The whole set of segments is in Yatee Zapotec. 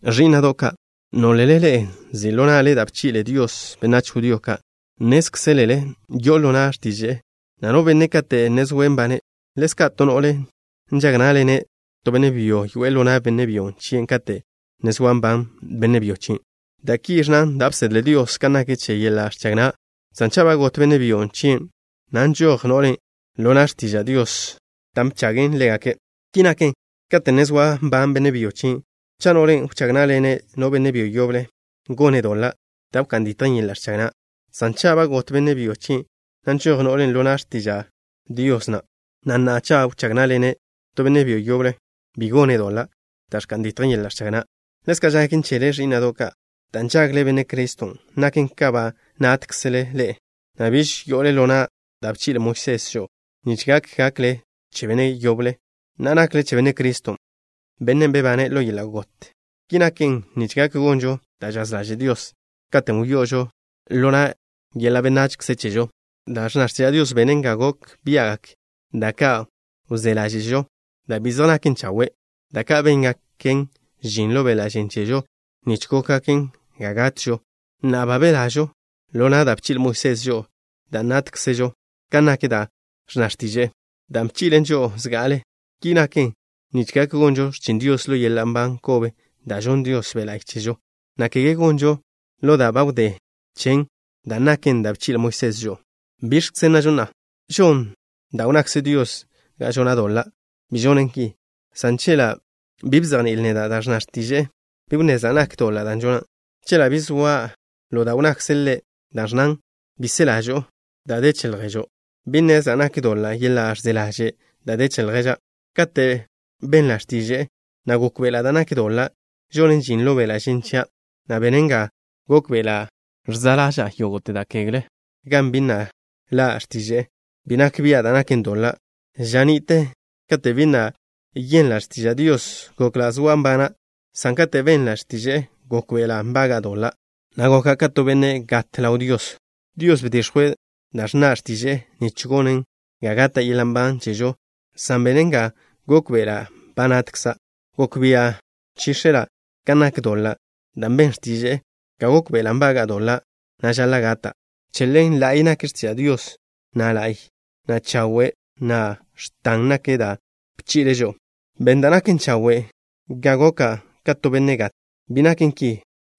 Ẕí'na'do' ka', nólele ḻe'e nzi' ḻo na'le da' bchi'le Dios benách judío ka'. Nnézkzelele yo'o ḻo na' x̱tiže'e na' no benne' kate' ne zoe' nbane'. Ḻezka' to no'le nžag ná'ḻene' to benne' byo yoe'e ḻo na' benne' byo chien' kate' ne zoa nban benne' byo chien', dan' ki ẕnna da' bsedle Dios kan nak che yeḻa' ẕchag na', san cha' ba got benne' byo chien', na' nžoj no'len' ḻo na' x̱tiža' Dios dan' bchagen ḻégake'. Ki naken, kate' ne zoa nban benne' byo chien', cha' no'len' wchág ná'ḻene' no benne' byo yoble, gone' doḻa' da' wká'n ditjen yeḻa' ẕchag na', san cha' ba got benne' byo chien', na' nžoj no'len' ḻo na' x̱tiža' Dios na', na' na'a, cha' wchág ná'ḻene' to benne' byo yoble, bi gone' doḻa' da' ẕka'n ditjen yeḻa' ẕchag na'. Ḻezka' žaken chele, ẕí'na'do' ka'. Dan' nžagle Benne' Criston', naken ka ba nátkzele ḻe'e, na' biž yo'ole ḻo na' da' bchi'le Moisés žo'o, nich gak gakle che Benne' yoblen'. Na'a nakle che Benne' Criston', Bennen' bebane' ḻo yeḻa' got. Ki naken nich gak gonžo da' žaz ḻaže' Dios. Katen' wyo'ožo ḻo na' yeḻa' benachze chežo, da' ẕnna x̱tiža' Dios benen ga gok bia'gak da' ka' wzé ḻáže'žo da' bi zej naken chawe', da' ka' béngaken žin ḻo beḻa' žen chežo nich góngaken ga gatžo. Na'a ba belažo ḻo na' da' bchi'le Moisés žo'o dan' nátkzežo kan nak da' ẕnna x̱tiže'e, dan' bchi'len žo'o zga'ale. Ki naken nich gak gonžo x̱chin Dios ḻo yeḻa' nban kobe da' žonn Dios Be' La'y chežo, na' kege gonžon ḻo da' ba wdé chen, dan' naken dan' bchi'le Moisés žo'o. ¿Biẕkze nnažo na'a? ¿Žon da' wnnakze Dios ga žona' doḻa'? Bi žonen ki, san chela' bi bzejní'il neda' da' ẕnna x̱tiže'e, bi wnnezla' nak doḻa' da' žona'. Chela' bi zoa ḻo da' wnnakze' Ḻe' da' ẕnnan: “Bi se ḻažo'o da' de che lježo'” bi nnezla' nak doḻa' yeḻa' ẕze ḻaže' da' de che lježa'. Kate' benla' x̱tiže'e, na' gókbe'ela' da' nak doḻa' žonen žin ḻo beḻa' žen chia', na' benen ga gókbe'ela' ẕze ḻaža'a yógo'te da' kegle. Gan bi na' ḻa' x̱tiže'e, bi nak bia' da' naken doḻa'. Ža ni'te, kate' bi na' yenla' x̱tiža' Dios, gokla' zoa' nbana', san kate' benla' x̱tiže'e, gókbe'ela' nbaga'a doḻa', na' goka' ka to benne' gat ḻaw Dios. Dios bdix̱jwe' da' ẕnna x̱tiže'e nich gonen ga gata' yeḻa' nban chežo, san benen ga gókbe'ela' ba natkza'. Gok bia' nchíx̱ela' kan nak doḻa', dan' ben x̱tiže'e ga gókbe'ela' nbaga'a doḻa', na' žaḻa' gata'. Che ḻen, la'y nak x̱tiža' Dios, na' la'y, na' chawe', na' x̱tan nak da' bchi'le' žo'o. ¿Ben da' naken chawe' ga goka' ka to benne' gat? Bi naken ki,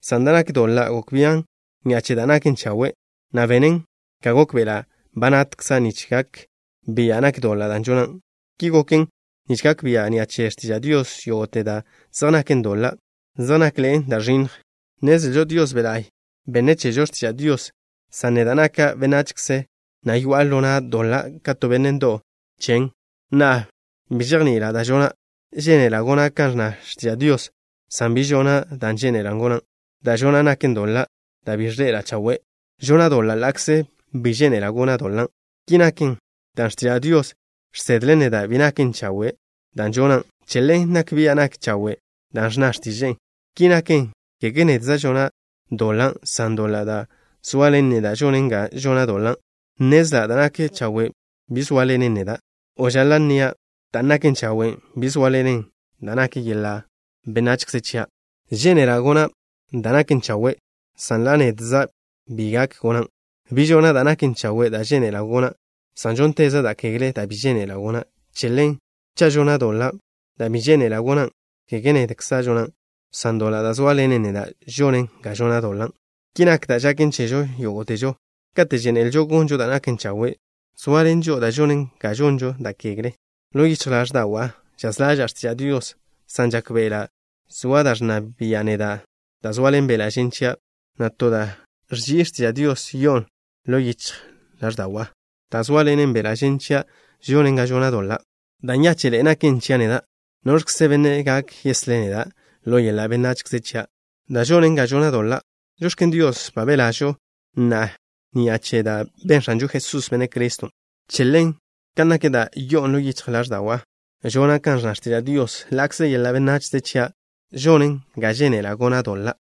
san da' nak doḻa' gok bian' ni'a che da' naken chawe', na' benen ga gókbe'ela' ba natkza' nich gak bia' nak doḻa' da' žona'. Ki goken nich gak bia' ni'a che x̱tiža' Dios yógo'te da' zej naken doḻa' zej nakḻe'en da' ẕinnj. Nnezlžo Dios Be' La'y benne' chežo x̱tiža' Dios, san neda' naka' benachze, na' yoa'a ḻo na' doḻa' ka to benne' ndo'w chen. Na'a, bi žejni'ila' da' žona'. Žénela' gona' kan ẕnna x̱tiža' Dios, san bi žona' dan' žénela' gona'. Da' žona' naken doḻa' da' bi ẕḻe'ela' chawe'. Žona' doḻa' ḻa'kze bi žénela' gona' doḻan'. Ki naken dan' x̱tiža' Dios žsedlen neda' bi naken chawe' da' žona'. Che ḻen nak bia' nak chawe' da' ẕnna x̱tiže'e. Ki naken, kege nedza' žona' doḻan', san doḻa' da' zoaḻen neda' žonen ga žona' doḻan'. Nnezla' da' nak chawe' bi zóaḻenen neda', o žaḻa' nnia', dan' naken chawe' bi zóaḻenen da' nak yeḻa' benachze chia'. Žénela' gona' dan' naken chawe', san ḻa' nedza' bi gak gonan'. Bi žona' da' naken chawe' da' žénela' gona', san žónteza' da' kegle da' bi žénela' gona'. Che ḻen, cha' žona' doḻa' da' bi žénela' gona', kege nedkza' žonan', san doḻa' da' zóaḻenen neda' žonen ga žona' doḻan'. Ki nak da' žaken chežo yógo'težo. Kate' žénelžo gonžo da' naken chawe', zoaḻen žo'o da' žonen ga žonžo da' kegle. Ḻo yichj ḻáẕda'wa' žaz ḻaža'a x̱tiža' Dios, san žákbe'ela' zoa da' ẕnna bia' neda' da' zoaḻen beḻa' žen chia', na' to da' ẕži'i che x̱tiža' Dios yo'on ḻo yichj ḻáẕda'wa'. Dan' zóaḻenen beḻa' žen chia' žonen ga žona' doḻa'. ¡Da' nyáche'ḻe'e naken chia' neda'! ¿Noẕkze benne' gak yeslé' neda' ḻo yeḻa' benachze chia' da' žonen ga žona' doḻa'? ¡Žox̱ken Dios, ba belažo na'a ni'a che da' ben X̱anžo Jesús, Benne' Criston'! Che ḻen, kan nak da' yo'on ḻo yichj ḻáẕda'wa' žona' kan ẕnna x̱tiža' Dios, ḻa'kze yeḻa' benachze chia' žonen ga žénela' gona' doḻa'.